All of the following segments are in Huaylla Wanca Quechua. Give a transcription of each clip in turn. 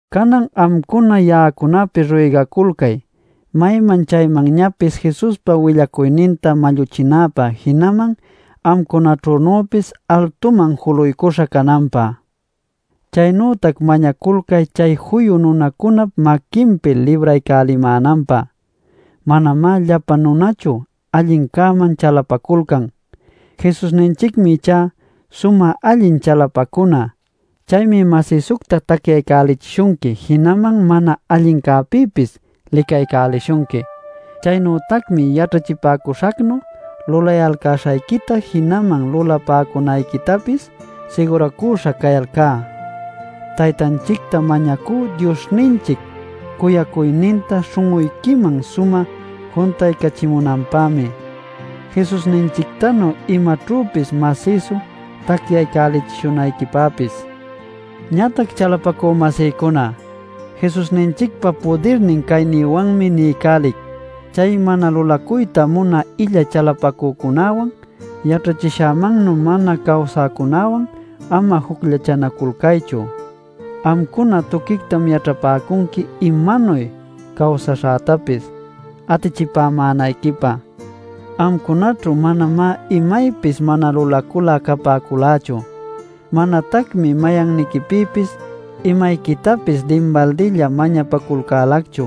Canan amcuna ya'acunapi ruygaculcay mayman chaymanñapis Jesuspa willacuyninta malluchinäpä jinaman amcunaćhünüpis altuman juluycuśha cananpä. Chaynütac mañaculcay chay juyu nunacunap maquinpi libraycälimänanpä; manamá llapa nunachu allincäman chalapaculcan. Jesusninchicmi ichá sumä allin chalapacuna. Chaymi masïsucta tacyaycälichishunqui jinaman mana allincäpïpis licaycälishunqui. Chaynütacmi yaćhachipäcuśhacnu lulayalcäśhayquita jinaman lulapäcunayquitapis siguracüśha cayalcá. Taytanchicta mañacú Diosninchic cuyacuyninta śhun'uyquiman sumä juntaycachimunanpämi, Jesusninchictanu imaćhüpis masïsu tacyaycälichishunayquipäpis. Ñatac, chalapacü-masïcuna, Jesusninchicpa pudirnin caynïwanmi niycälic: chay mana lulacuyta munä illa chalapacücunäwan, yaćhachishämannu mana cawsäcunäwan ama jucllachanaculcaychu. Amcuna tuquictam yaćhapäcunqui imanuy cawsaśhätapis, atichipämänayquipä: amcunaćhu manamá imaypis mana lulacul'a capäculächu, manatacmi mayanniquipïpis imayquitapis dinbaldilla mañapaculcälacchu.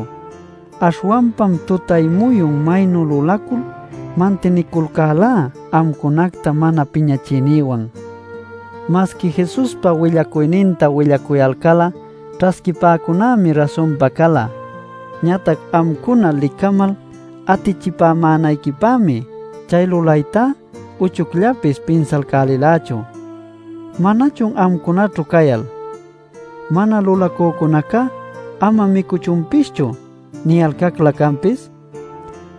Aśhwanpam tutay-muyun maynu lulacul mantiniculcälá amcunacta mana piñachiynïwan. Masqui Jesuspa willacuyninta willacuyalcal'a ćhasquipäcunämi rasunpa cala. Ñatac amcuna licamal atichipämänayquipämi chay lulaytá uchucllapis pinsalcälilächu. ¿Manachun amcunaćhu cayal: “Mana lulacücunacá ama micuchunpischu” niyalcaclä canpis?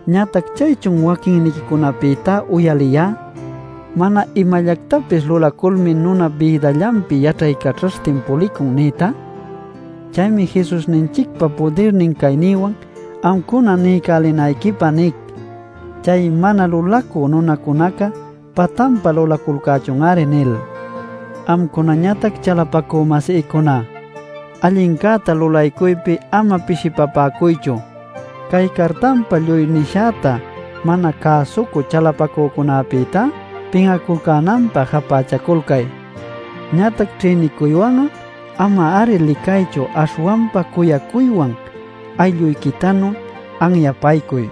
Ñatac ¿chaychun waquinniquicunapïta uyaliyá “Mana imallactapis lulaculmi nunap bïdallanpi yaćhaycaćhaśhtin pulicun” nïta? Chaymi Jesusninchicpa pudirnin caynïwan amcuna niycälinayquipä nic: “Chay mana lulacü nunacunaca patanpä lulaculcächun-ari” nil. Amcunañatac, chalapacü-masïcuna, allincäta lulaycuypi ama pishipapäcuychu. Cay cartanpa lluy nishäta mana cäsucü chalapacücunapïtá pin'aculcänanpä japächaculcay. Ñatac ćhïnicuywan'a ama-ari licaychu aśhwanpa cuyacuywan aylluyquitanu anyapaycuy.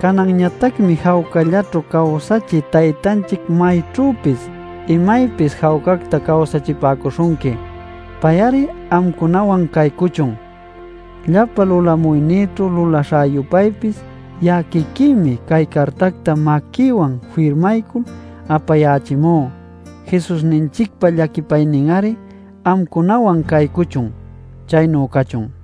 Cananñatacmi jawcallaćhu cawsachï Taytanchic mayćhüpis imaypis jawcacta cawsachipäcuśhunqui. Pay-ari amcunawan caycuchun. Llapa lulamuynïćhu lulaśhä-yupaypis ya'a quiquïmi cay cartacta maquïwan firmaycul apayächimú. Jesusninchicpa llaquipaynin-ari amcunawan caycuchun. Chaynu cachun.